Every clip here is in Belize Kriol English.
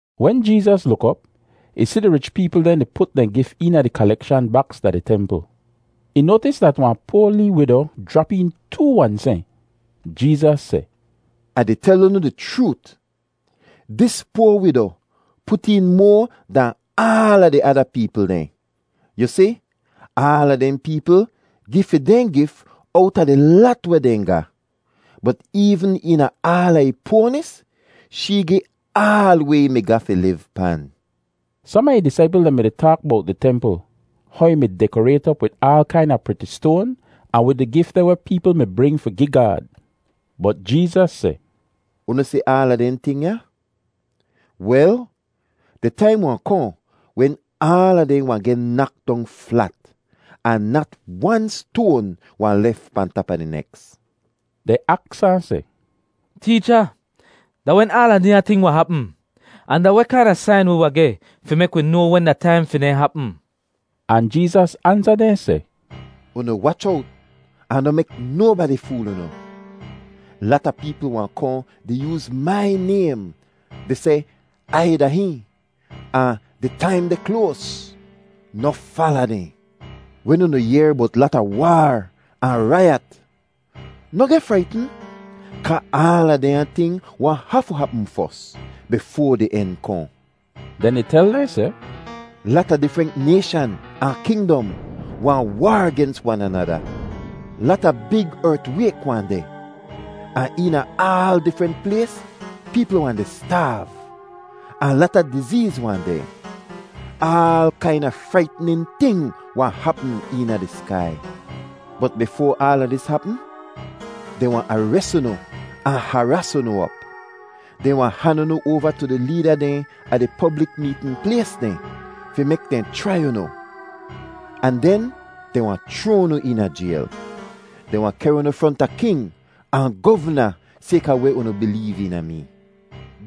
Wen Jeezas luk op, ih si di rich peepl dehn di put dehn gif eena di kalekshan baks da di templ. Ih noatis dat wahn poa lee wido jrap een too wan sehn. Jeezas seh, “Ah di tel unu di chroot, dis poa wido put een moa dahn aala di ada peepl dehn. Yu si, aala dehn peepl gi fi dehn gif owta di lat weh dehn ga. Bot eevn eena aala ih poanis, shee gi aal weh ih mi ga fi liv pan.” Som a ih disaipl dehn mi-di taak bowt di templ, how ih mi dekorayt op wid aal kaina priti stoan ahn wid di gif dehn weh peepl mi bring fi gi Gaad. Bot Jeezas seh, “Unu si aala dehn ting ya? Wel, di taim wahn kohn wen aala dehn wahn geh nak dong flat ahn nat wan stoan wahn lef pahn tap a di neks.” Dehn aks ahn seh, “Teecha, da wen aala dehnya ting wahn hapm? Ahn da weh kaina sain wi wahn geh fi mek wi noa wen da taim fi dehn hapm?” Ahn Jeezas ansa dehn seh, “Unu wach owt ahn noh mek nobadi fool unu. Lata peepl wahn kohn di yooz mai naym di seh, ‘Ai da hihn,’ ahn ‘Di taim deh kloas!’ Noh fala dehn. Wen unu yehr bowt lata waar ahn raiyat, noh geh fraitn, kaa aala dehnya ting wahn hafu hapm fos, bifoa di en kohn.” Den ih tel dehn seh, “Lata difrent nayshan ahn kingdom wahn waar gens wan anada. Lata big ertwayk wahn deh, ahn eena aal difrent plays peepl wahn di staav, ahn lata dizeez wahn deh. Aal kaina fraitnin ting wahn hapm eena di skai. “Bot bifoa aala dis hapm, dehn wahn ares unu ahn haraas unu op; dehn wahn han unu oava tu di leeda dehn a di poblik meetn plays dehn fi mek dehn chrai unu, ahn den dehn wahn chroa unu eena jayl. Dehn wahn kehr unu fronta king ahn govna sayka weh unu bileev eena mee.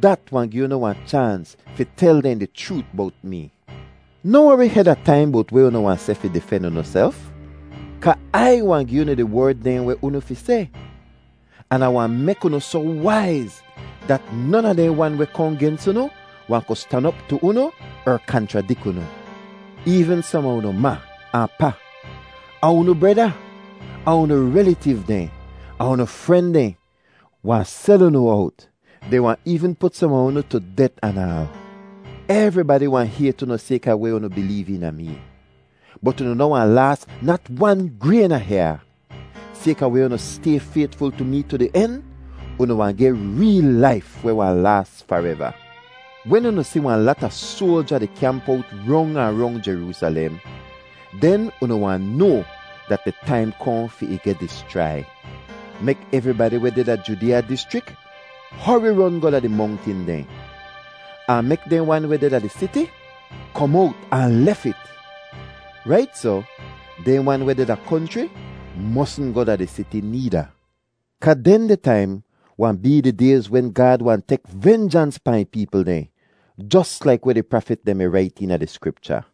Dat wahn gi unu wahn chaans fi tel dehn di chroot bowt mee. Noh wori heda taim bowt weh unu wahn seh fi difen unuself, kaa Ai wahn gi unu di werd dehn weh unu fi seh, an Ah wahn mek unu soh waiz dat non a dehn wan weh kohn gens unu wahn ku stan op tu unu er kanchradik unu. Eevn som a unu ma ahn pa, ahn unu breda, ahn unu relitiv dehn, ahn unu fren dehn wahn sel unu owt. Dehn wahn eevn put som a unu tu det anaal. Evribadi wahn hayt unu sayka weh unu bileev eena mee. Bot unu noh wahn laas nat wan grayn a hyaa. Sayka weh unu stay faytful tu mee tu di en, unu wahn geh reel laif weh wahn laas fareva. “Wen unu si wahn lata soalja di kyamp owt rong ahn rong Jeroosalem, den unu wahn noa dat di taim kohn fi ih geh dischrai. Mek evribadi weh deh da Judeeya dischrik hori ron goh da di mongtin dehn, ahn mek dehn wan weh deh da di siti kom owt ahn lef it. Rait soh, dehn wan weh deh da konchri mosn goh da di siti needa. Kaa dehndeh taim wahn bee di dayz wen Gaad wahn tek venjans pahn ih peepl dehn jos laik weh di prafit dehn mi rait eena di Skripcha.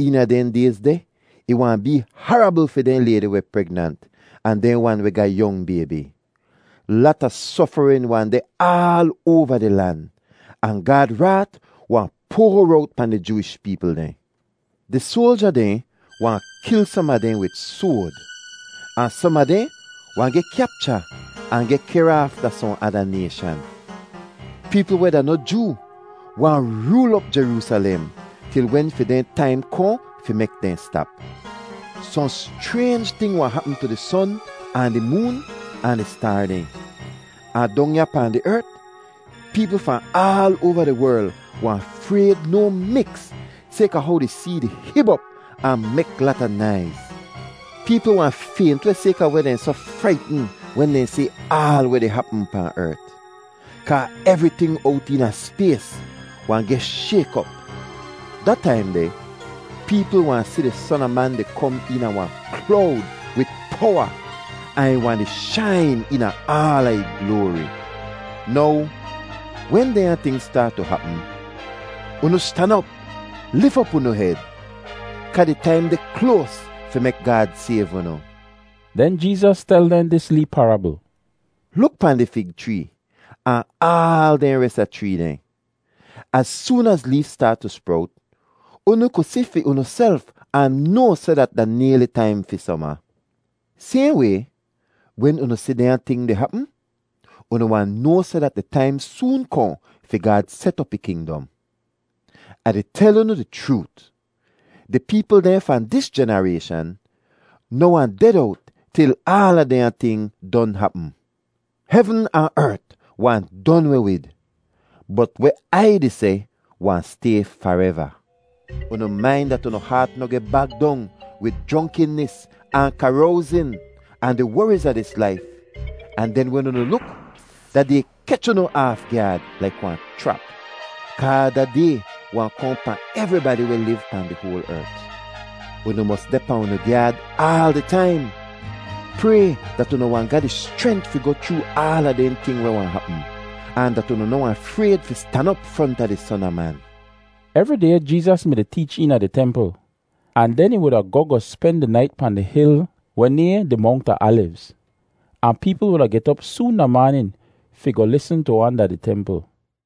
Eena dehn dayz deh ih wahn bee harabl fi dehn laydi weh pregnant ahn dehn wan weh ga yong baybi! Lata sofarin wahn deh aal oava di lan, ahn Gaad raat wahn poar owt pahn di Jooish peepl dehn. Di soalja dehn wahn kil som a dehn wid soad, ahn som a dehn wahn geh kyapcha ahn geh kehr aaf da sohn ada nayshan; peepl weh da noh Joo wahn rool op Jeroosalem til wen fi dehn taim kohn fi mek dehn stap. “Sohn schraynj ting wahn hapm tu di son ahn di moon ahn di staar dehn. Ahn dong ya pahn di ert, peepl fahn aal oava di werl wahn frayd no miks sayka how di see di hib op ahn mek lata naiz. Peepl wahn faynt weh sayka weh dehn soh fraitn wen dehn si aal weh di hapm pahn ert, kaa evriting owt eena spays wahn geh shayk op. Da taim deh peepl wahn si di Son a Man di kom eena wahn klowd wid powa, ahn ih wahn di shain eena aala ih gloari. Now wen dehnya ting staat tu hapm, unu stan op, lif op unu hed, kaa di taim deh kloas fi mek Gaad sayv unu.” Den Jeezas tel dehn dis lee parabl: “Luk pahn di fig chree ahn aal dehn res a chree dehn; az soon az leef staat tu sprowt, unu ku si fi unuself ahn noa seh dat da nayli taim fi soma. Sayhn way, wen unu si dehnya ting di hapm, unu wahn noa seh dat di taim soon kohn fi Gaad set op ih kingdom. “Ah di tel unu di chroot, di peepl dehn fahn dis jenarayshan noh wahn ded owt til aala dehnya ting don hapm. Hevn ahn ert wahn don weh wid, bot weh Ai di seh wahn stay fareva. “Unu main dat unu haat noh geh bag dong wid jronkinis ahn karowzin, ahn di woriz a dis laif, ahn den wen unu luk, da Day kech unu aaf gyaad laik wahn chrap. Kaa da Day wahn kohn pahn evribadi weh liv pahn di hoal ert. Unu mos deh pahn unu gyaad aal di taim. Pray dat unu wahn ga di schrent fi goh chroo aala dehn ting weh wahn hapm, ahn dat unu noh wahn frayd fi stan op fronta di Son a Man.” Evri day Jeezas mi-di teech eena di templ, ahn den ih wuda goh goh spen di nait pahn di hil weh nayhn di Mongt a Alivz. Ahn peepl wuda get op soon da maanin fi goh lisn tu ahn da di templ.